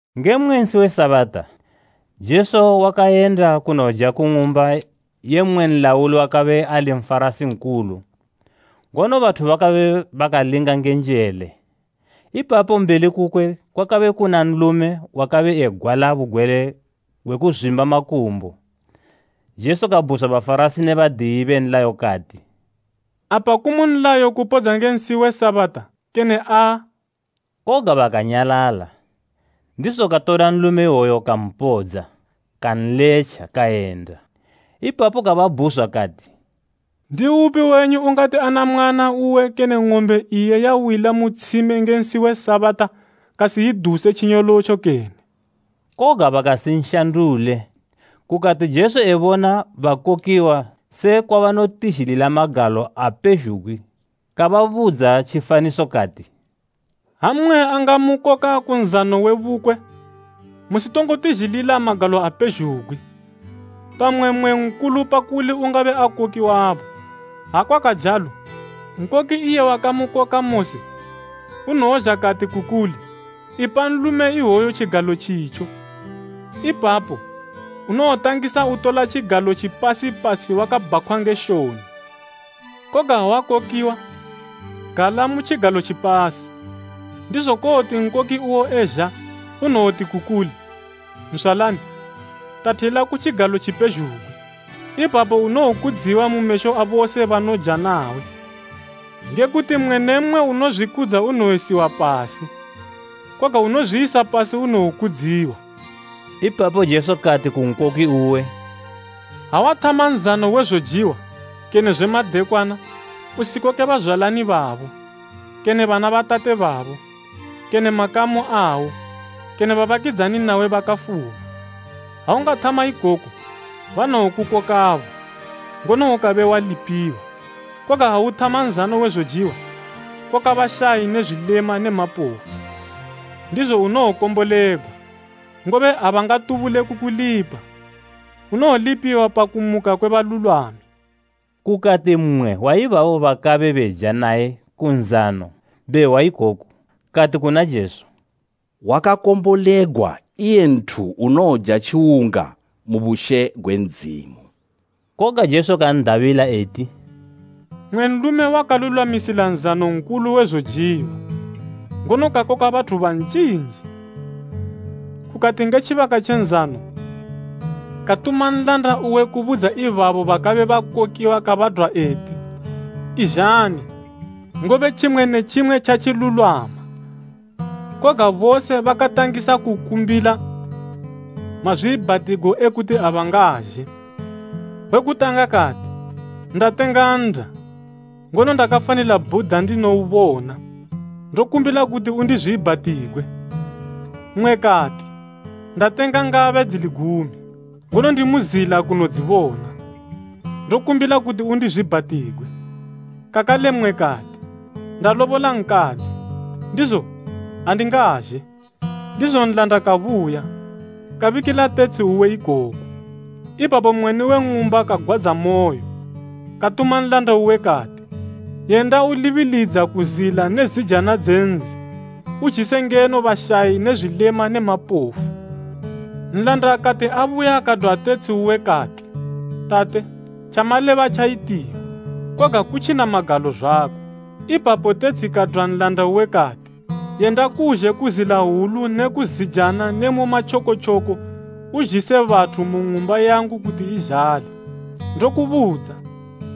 Nge mmwe nsi we Sabata, Jesu wakayenda kunoja ku ng'umba ye mmwe nlauli wakabe ali Nfarasi nkulu, ngono bathu bakabe bakanlinga nge njele. Ipapo mbeli kukwe kwakabe kuna nlume wakabe egwala bugwele gwe kuzwimba makumbo. Jesu kabhuzwa Bafarasi ne badiyi be nlayo kati, “Apa kumu nlayo kupodza nge nsi we Sabata, kene aa?” Koga bakanyalala, ndizo katola nlume iwoyo kampodza, kanletja kayenda. Ipapo kababhuzwa kati, “Ndiupi wenyu ungati ana mwana uwe kene ng'ombe iye yawila mu tshime nge nsi we Sabata, kasiyiduse tjinyolotjo kene?” Koga bakasinshandule. Kukati Jesu ebona bakokiwa sekwa banotizhilila magalo apezhugwi kababudza tjifaniso, kati, “Ha mmwe angamukoka ku nzano we bukwe, musitongo tizhilila magalo apezhugwi, pamwe mmwe nkulu pakuli ungabe akokiwabo. Ha kwakajalo, nkoki iye wakamukoka mose, unowozha kati ku kuli, ‘Ipa nlume iwoyu tjigalo tjitjo.’ Ipapo, unowotangisa utola tjigalo tjipasi pasi wakabhakhwa nge shoni. Koga ha wakokiwa, gala mu tjigalo tjipasi, ndizo kowoti nkoki uwo ezha, unowoti ku kuli, ‘Nzwalani, tathila ku tjigalo tjipezhugwi.’ Ipapo, unowokudziwa mu mesho abose banoja nawe. Nge kuti mmwe ne mmwe unozwikudza unowoyisiwa pasi, koga unozwiyisa pasi unowokudziwa.” Ipapo Jesu kati ku nkoki uwe, “Ha wathama nzano we zojiwa, kene zwe madekwana, usikoke bazwalani babo, kene bana ba tate babo, kene makamu awo kene babakidzani nawe bakafuma, ha ungathama ikoku, banowokukokabo, ngono ukabe walipiwa. Koga ha uthama nzano we zojiwa, koka bashayi ne zwilema ne mapofu. Ndizo unowokombolegwa, ngobe abangatubule kukulipa. Unowolipiwa pa kumuka kwe balulwami.” Kukati mmwe wa ibabo bakabe beja naye ku nzano be hwa ikoku, kati kuna Jesu, “Wakakombolegwa iye nthu unowoja tjiwunga mu bushe gwe Ndzimu.” Koga Jesu kan'dabila eti, “Mmwe nlume wakalulwamisila nzano nkulu we zojiwa, ngono kakoka bathu banjinji. Kukati nge tjibaka tje nzano katuma nlanda uwe kubudza ibabo bakabe bakokiwa kabadwa eti ‘Izhani, ngobe tjimwe ne tjimwe tjatjilulwama.’ Koga bose bakatangisa kukumbila mazwiibhatigo e kuti abangazhe. We kutanga kati, ‘Ndatenga nnda, ngono ndakafanila bhuda ndinoubona. Ndokumbila kuti undizwiibhatigwe.’ Mmwe kati, ‘Ndatenga ngabe dzili gumi, ngono ndimu zila kunodzibona. Ndokumbila kuti undizwiibhatigwe.’ Kakale mmwe kati, ‘Ndalobola nkadzi, ndizo andingazhe!’ “Ndizo nlanda kabuya, kabikila tetshi uwe ikoku. Ipapo mweni we ng'umba kagwadzamoyo katuma nlanda uwe kati, ‘Yenda ulibilidza ku zila ne zijana dze nzi, uzhise ngeno bashayi ne zwilema ne mapofu.’ Nlanda kati abuya kadwa tetshi uwe kati, ‘Tate, tjamaleba tjayitiwa, koga kutjina magalo zwako.’ Ipapo tetshi kadwa nlanda uwe kati, ‘Yenda kuzhe ku zila hwulu ne ku zijana ne mu matjokotjoko uzhise bathu mu ng'umba yangu kuti izhale. Ndokubudza,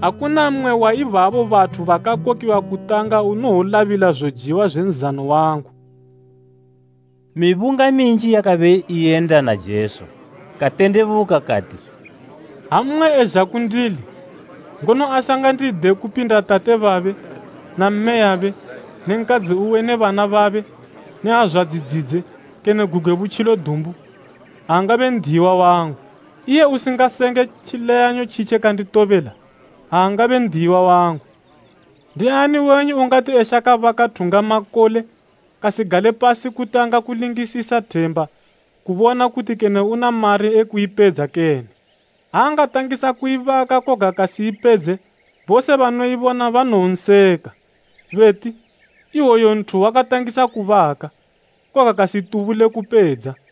akuna mmwe wa ibabo bathu bakakokiwa kutanga unowolabila zojiwa zwe nzano wangu.’” Mibunga minji yakabe iyenda na Jesu, katendebuka kati, “Ha mmwe ezha kundili, ngono asingandide kupinda tate babe, na mmeyabe ne nkadzi uwe ne bana babe ne azwadzi dzidze kene gugwe butjilo dumbu, aangabe n'diyiwa wangu. Iye usingasenge tjileyanyo tjitje kanditobela, aangabe n'diyiwa wangu. “Ndiani wenyu ungati eshaka baka thungamakole, kasigale pasi kutanga kulingisisa themba, kubona kuti kene una mari e kuipedza kene? Ha angatangisa kuibaka koga kasiyipedze, bose banoibona banowonseka. Beti, ‘Iwoyu nthu wakatangisa kubaka, koga kasitubule kupedza.’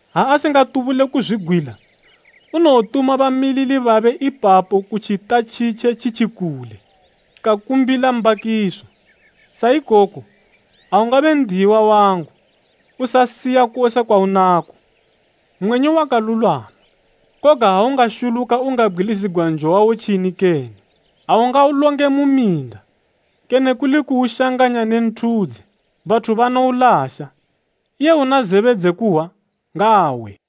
Ha asingatubule kuzwigwila, unowotuma bamilili babe ipapo ku tjita tjitje tjitjikule, kakumbila mbakiso. Sa ikoko, aungabe n'diyiwa wangu, usasiya kose kwaunako.” “Mwenyu wakalulwama, koga ha ungashuluka ungabgwilizigwa njo wawo tjini kene? Aungaulonge mu minda, kene kuli kuushanganya ne nthudze. Bathu banoulasha. Iye una zebe dze kuhwa, ngaahwe.”